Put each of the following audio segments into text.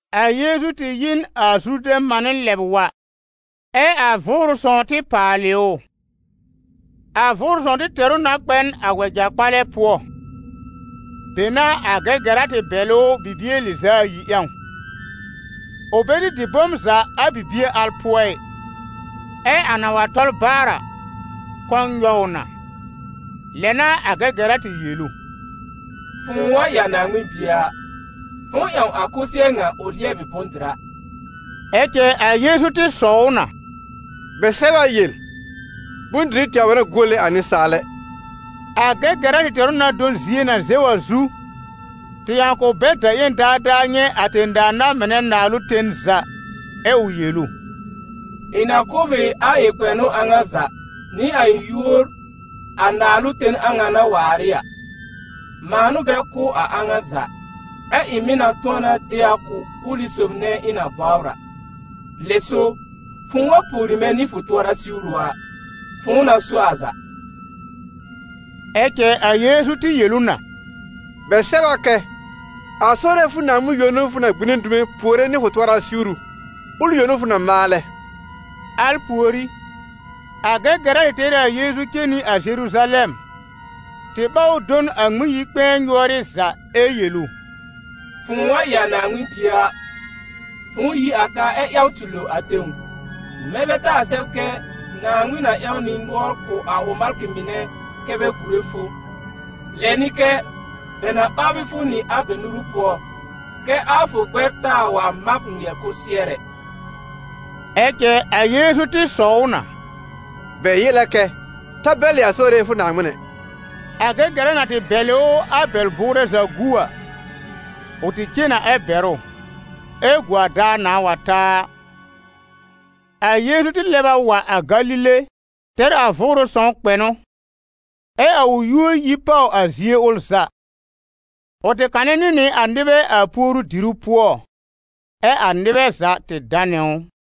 A Yeezu tɩ yi n a Zurdɛ̃ mànɩ́ lɛb wa, ɛ a Vʋʋrʋ Sõw tɩ paalɩ ʋ. A Vʋʋrʋ sõw tɩ tɛr ʋ na kpɛ n a wɛja-kpalɛ pʋɔ, be n'a a Gɛgɛra tɩ bɛlɩ ʋ bibie lɩz'a ayi ƴãw. Ʋ bɛ tɩ dɩ bom za a bibie al pʋɔ ɩ, ɛ a na wa tɔl baar a, kɔ̃ nyɔw ʋ na. Lɛ n'a a Gɛgɛra tɩ yel ʋ «Fʋ̃ʋ wa ɩ a Naaŋmɩn Bie a, fʋ̃ʋ ƴãw a kʋsɩɛr ŋa ʋ lɩɛbɩ bʋ̃-dɩra» Ɛ cɛ a Yeezu tɩ sɔw ʋ na: «Bɛ sɛb a yel: ‹Bʋ̃-dɩrɩ tɛwr bɛ n'a guole a nɩsaal ɛ.›» A Gɛgɛra tɩ tɛr ʋ na do n zie na zɛw a zu, tɩ ƴãw k'ʋ bɛl da-ƴẽn daadaa nyɛ̃ a tẽ-daa na-mɩnɛ naalʋ ten za, ɛ ʋ yel ʋ: «Ɩ̃ na kʋ̀ b ɩ a kpɛ̃nʋ a ŋa za, nɩ a yúor a naalʋ ten a ŋa na waar ɩ a: mãa n'ʋ bɛ kʋ̀ a a ŋa za, ɛ ɩ̃ mɩ̀ na tʋ̃ɔ na de a kʋ̀ ʋlɩ sob nɛ ɩ̃ na bɔbr a. Lɛ so, fʋ̃ʋ wa pùori mɛ̃ nɩ fʋ tʋɔra siwru a, fʋ̃ʋ na so a za.» Ɛ cɛ a Yeezu tɩ yel ʋ na: «Bɛ sɛb a kɛ: ‹A Sore fʋ Naaŋmɩn yõ n'ʋ fʋ na gbine dume puore nɩ fʋ tʋɔra siwru, ʋl yõ n'ʋ fʋ na maalɛ.›» Al pùorí a Gɛgɛra tɩ tɛr ɩ a Yeezu cen nɩ a Zeruzalɛm, tɩ ɓáw ʋ do n a Ŋmɩn-yi-kpɛ̃ɛ nyʋ́ɔrɩ́ za ɛ yel ʋ: «Fʋ̃ʋ wa ɩ a Naaŋmɩn Bie a, fʋ̃ʋ yi a ka, ɛ ƴaw tɩ lo a tẽw; mɛ̃ bɛ taa sɛb kɛ ‹Naaŋmɩn na ƴãw nɩ nʋɔr kʋ̀ a ʋ malkɩ mɩnɛ kɛ́ bɛ gùre fʋ.› Lɛ nɩ kɛ: ‹Bɛ na ɓaabɩ fʋ nɩ a bɛ nuru pʋɔ, kɛ́ a fʋ gbɛr taa wa mab ŋmɩɛr kʋsɩɛr ɛ.›» Ɛ cɛ a Yeezu tɩ sɔw ʋ na: «Bɛ yel a kɛ: ‹Ta bɛlɩ a Sore fʋ Naaŋmɩn ɛ.›» A Gɛgɛra na tɩ bɛlɩ ʋ a bɛl-bʋʋrɛ za gu a, ʋ tɩ cen na ɛ bɛr ʋ, ɛ gu a daar nãa wa ta a. A Yeezu tɩ lɛb a wa a Galile, tɛr a Vʋʋrʋ Sõw kpɛ̃nʋ, ɛ a ʋ yúor yi pàw a zie ʋl za. Ʋ tɩ kanɛ nɩ nɩ a nɩbɛ a puoru-diru pʋɔ, ɛ a nɩbɛ za tɩ danɛ ʋ.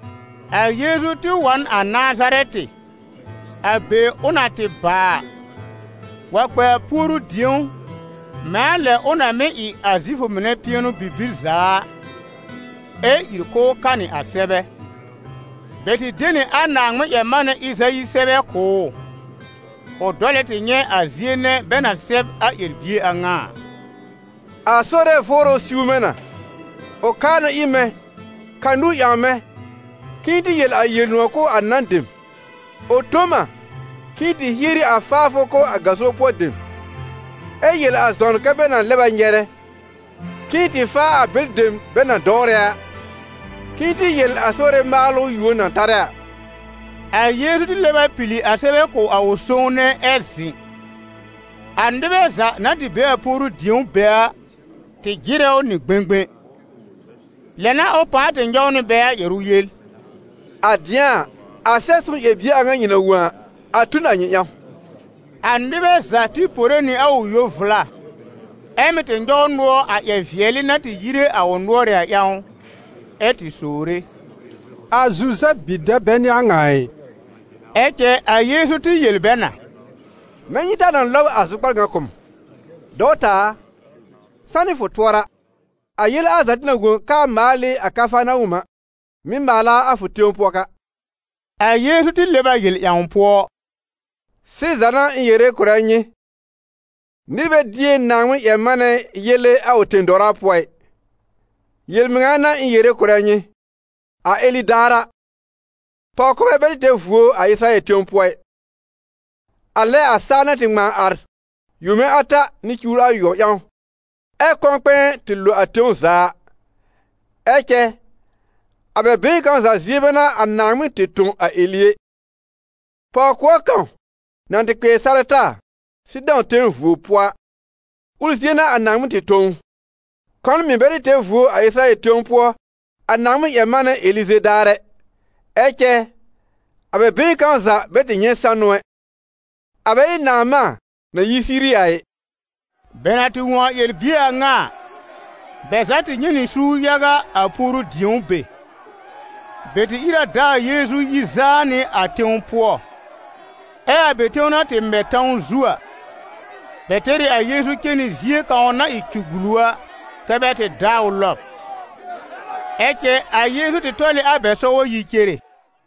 A Yeezu tɩ wa n a Nazarɛtɩ, a be ʋ na tɩ baa a, wa kpɛ a puoru-dĩ̀ó, mɛ̃ a lɛ ʋ na mɩ̀ ɩ a Zifʋ mɩnɛ pɩɛnʋ-bibir za a, ɛ ìr k'ʋʋ kanɩ a sɛbɛ. Bɛ tɩ de nɩ a Naaŋmɩn-ƴɛr-manɛ Ɩzayi sɛbɛ kʋ̀ ʋ, ʋ dɔlɛ tɩ nyɛ̃ a zie nɛ bɛ na sɛb a ƴɛr-bie a ŋa a: «A Sore Vʋʋrʋ siw mɛ̃ na, ʋ kaa na ir mɛ̃ ka nũu ƴãw mɛ̃ k'ɩ̃ɩ tɩ yel a Yel-nʋ̃ɔ̀ kʋ̀ a nan dem. Ʋ tõ m a k'ɩ̃ɩ tɩ hieri a faafʋ kʋ̀ a gaso pʋɔ dem, ɛ yel a zɔn kɛ bɛ na lɛb a nyɛrɛ, k'ɩ̃ɩ tɩ faa a bɛlɩ dem bɛ na dɔwrɛ a, k'ɩ̃ɩ tɩ yel a Sore maalʋ yuon na tarɛ a.» A Yeezu tɩ lɛb a pili a sɛbɛ kʋ̀ a sõwne, ɛ zɩ̃. A nɩbɛ za na tɩ be a puoru-dĩ̀ó be a, tɩ jɩrɛ ʋ nɩ gbẽgbẽ. Lɛ n'a ʋ pãa tɩ nyɔw nɩ bɛ a ƴɛrʋ yel: «A dɩ̃a a, a Sɛb-sõw ƴɛr-bie a ŋa nyɩ na wõ a, a tu n a nyɩ ƴãw.» A nɩbɛ za tɩ pore nɩ a ʋ yo-vla, ɛ mɩ́ tɩ nyɔw nʋɔr a ƴɛr-vɩɛlɩ na tɩ yire a ʋ nʋ́ɔrɩ́ a ƴãw, ɛ tɩ sowre: «A Zuzɛb bi-dɛb bɛ n'ɩ a ŋa ɩ?» Ɛ cɛ a Yeezu tɩ yel bɛ na: «Mɛ̃ nyɩ taa na lɔb a zʋkpar ŋa kʋ̀ m: ‹Dɔwta a, sanɩ fʋ tʋɔra!› A yele al za tɩ na wõ k'aa maal ɩ a Kafarnawɔm a, mɩ̀ maal a a fʋ tẽw pʋɔ ka!» A Yeezu tɩ lɛb a yel ƴãw pʋɔ: «Sɩza n'a ɩ̃ yere kʋ̀rɛ nyɩ: nɩr bɛ dier Naaŋmɩn-ƴɛr-manɛ yele a ʋ tẽ-dɔwra pʋɔ ɩ. Yel-mɩŋa n'a ɩ̃ yere kʋ̀rɛ nyɩ, a Eli daar a, pɔw-kɔbɛ bɛ tɩ tɛr vuo a Ɩsɩrayɛl tẽw pʋɔ ɩ, a lɛ a saa na tɩ ŋmãa ar yome ata nɩ cuwr ayʋɔb ƴãw, ɛ kɔ̃-kpɛ̃ɛ tɩ lo a tẽw za a. Ɛ cɛ a bɛ been kãw za zie bɛ n'a a Naaŋmɩn tɩ tõ a Eli ɛ, pɔw-kʋɔr kãw na tɩ kpɩɛr Sarɛta, Sɩdɔ̃ tẽw vuo pʋɔ a, ʋl zie n'a a Naaŋmɩn tɩ tõ ʋ. Kɔn mɩ̀ bɛ tɩ tɛr vuo a Ɩsɩrayɛl tẽw pʋɔ a Naaŋmɩn-ƴɛr-manɛ Elize daar ɛ, ɛ cɛ a bɛ been kãw za bɛ tɩ nyɛ̃ sanʋ ɛ, a bɛ ɩ Naamã na yi Siiri a ɩ.» Bɛ na tɩ wõ a ƴɛr-bie a ŋa a, bɛ za tɩ nyɛ̃ nɩ suur yaga, a puoru-dĩ̀ó be. Bɛ tɩ ìr a dá a Yeezu yi zaa nɩ a tẽw pʋɔ. Ɛ a bɛ tẽw na tɩ mɛ̃ tãw zu a, bɛ tɛr ɩ a Yeezu cen nɩ zie kãw na ɩ cũgbulu a, kɛ bɛ tɩ daa ʋ lɔb. Ɛ cɛ ʋ tɩ tɔl ɩ a bɛ sɔgɔ yi cere.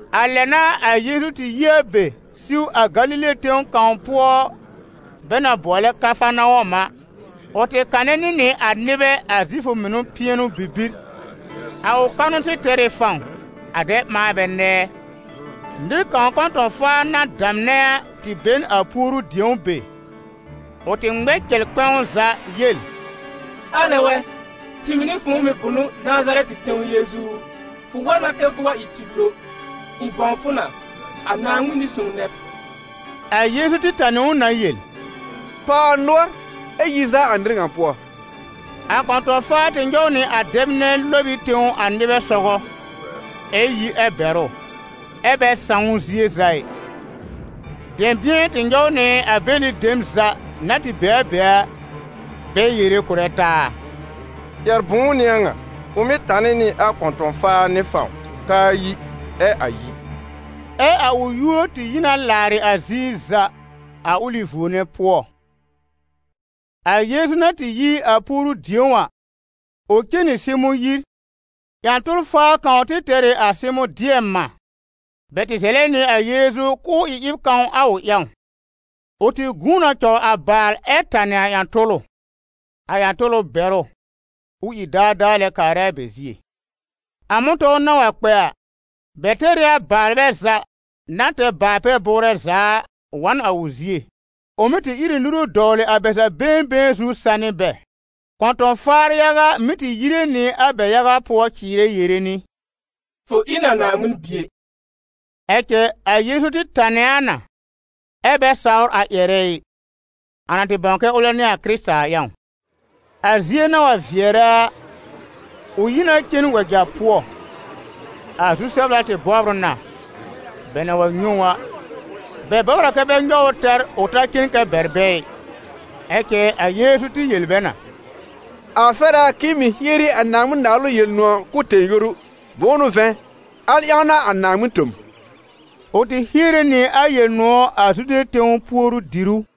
A lɛ n'a a Yeezu tɩ yi a be siw a Galile tẽw kãw pʋɔ bɛ na bʋɔlɛ Kafarnawɔm a. Ʋ tɩ kanɛ nɩ a nɩbɛ a Zifʋ mɩnɛ pɩɛnʋ-bibir. A ʋ kanʋ tɩ tɛr ɩ fãw, a dɛ ɓã bɛ nɛɛ. Nɩr kãw kɔ̃tɔ̃-faa na damnɛ a, tɩ be n a puoru-dĩ̀ó be. Ʋ tɩ ŋmɛ n cɛl kpɛ̃w za yel: «Alɛ wɛ! Tɩɩm nɩ fʋ̃ʋ mɩ̀ bʋnʋ̀, Nazarɛtɩ tẽw Yeezu u? Fʋ wa na kɛ fʋ wa ɩ tɩ lo. Ɩ̃ bãw fʋ na: a Naaŋmɩn Nɩ-sõw nɛ b!» A Yeezu tɩ tanɩ ʋ na yel: «Pàw a nʋɔr ɛ yi zaa a nɩr ŋa pʋɔ!» A kɔ̃tɔ̃-faa tɩ nyɔw nɩ a dɛb nɛ lɔb ɩ tẽw a nɩbɛ sɔgɔ, ɛ yi ɛ bɛr ʋ, ɛ bɛ sãw ʋ zie za ɩ. Dɛ̃bɩ̃ɛ tɩ nyɔw nɩ a bɛlɩ dem za na tɩ be a be a, bɛ yere kʋ̀rɛ taa: «Ƴɛr-bʋ̃ʋ n'ɩ a ŋa? Ʋ mɩ́ tanɩ nɩ a kɔ̃tɔ̃-faar nɩ fãw k'aa yi, ɛ a yi.» Ɛ a ʋ yúor tɩ yi na làarɩ a ziir za, a ʋlɩ vuo nɛ pʋɔ. A Yeezu na tɩ yi a puoru-dĩ̀ó a, ʋ cen nɩ Sɩmʋ̃ yir. Ƴã-tʋl-faa kãw tɩ tɛr ɩ a Sɩmʋ̃ dɩɛm-mã; bɛ tɩ zɛlɛ nɩ a Yeezu k'ʋʋ ɩ ɩb kãw a ʋ ƴãw. Ʋ tɩ gũu na cɔw a baal ɛ tanɩ a ƴã-tʋlʋ, a ƴã-tʋlʋ bɛr ʋ, ʋ ìr daadaa lɛ kaarɛ a bɛ zie. A mʋ̃tɔ̃w na wa kpɛ a, bɛ tɛr ɩ a baalbɛ za, na tɛr baal-pɛ-bʋʋrɛ za a, wa n a ʋ zie. Ʋ mí tɩ ír ɩ nuru dɔwlɩ a bɛ za been been zu sanɩ bɛ. Kɔ̃tɔ̃-faar yaga mɩ́ tɩ yire nɩ a bɛ yaga pʋɔ cɩɩrɛ yere nɩ: «Fʋ ɩ n a Naaŋmɩn Bie!» Ɛ cɛ a Yeezu tɩ tanɛ a na, ɛ bɛ sawr a ƴɛrɛ ɩ, a na tɩ bãw kɛ ʋlɛ n'ɩ a Kɩrɩta a ƴãw. A zie na wa vɩɛrɛ a, ʋ yi na cen wɛja pʋɔ. A zu-sɛbla tɩ bɔbr ʋ na; bɛ na wa nyɛ̃ ʋ a, bɛ bɔbr a kɛ bɛ nyɔw ʋ tɛr, ʋ ta cen kɛ bɛr bɛ ɩ. Ɛ cɛ a Yeezu tɩ yel bɛ na: «A fɛr a k'ɩ̃ɩ mɩ̀ hieri a Naaŋmɩn-Naalʋ Yel-nʋ̃ɔ̀ kʋ̀ tẽ- yoru. Bʋ̃ʋ n'ʋ vɛ̃, al ƴãw n'a a Naaŋmɩn tõ m.» Ʋ tɩ hiere nɩ a Yel-nʋ̃ɔ̀ a Zude tẽw puoru-dìrú.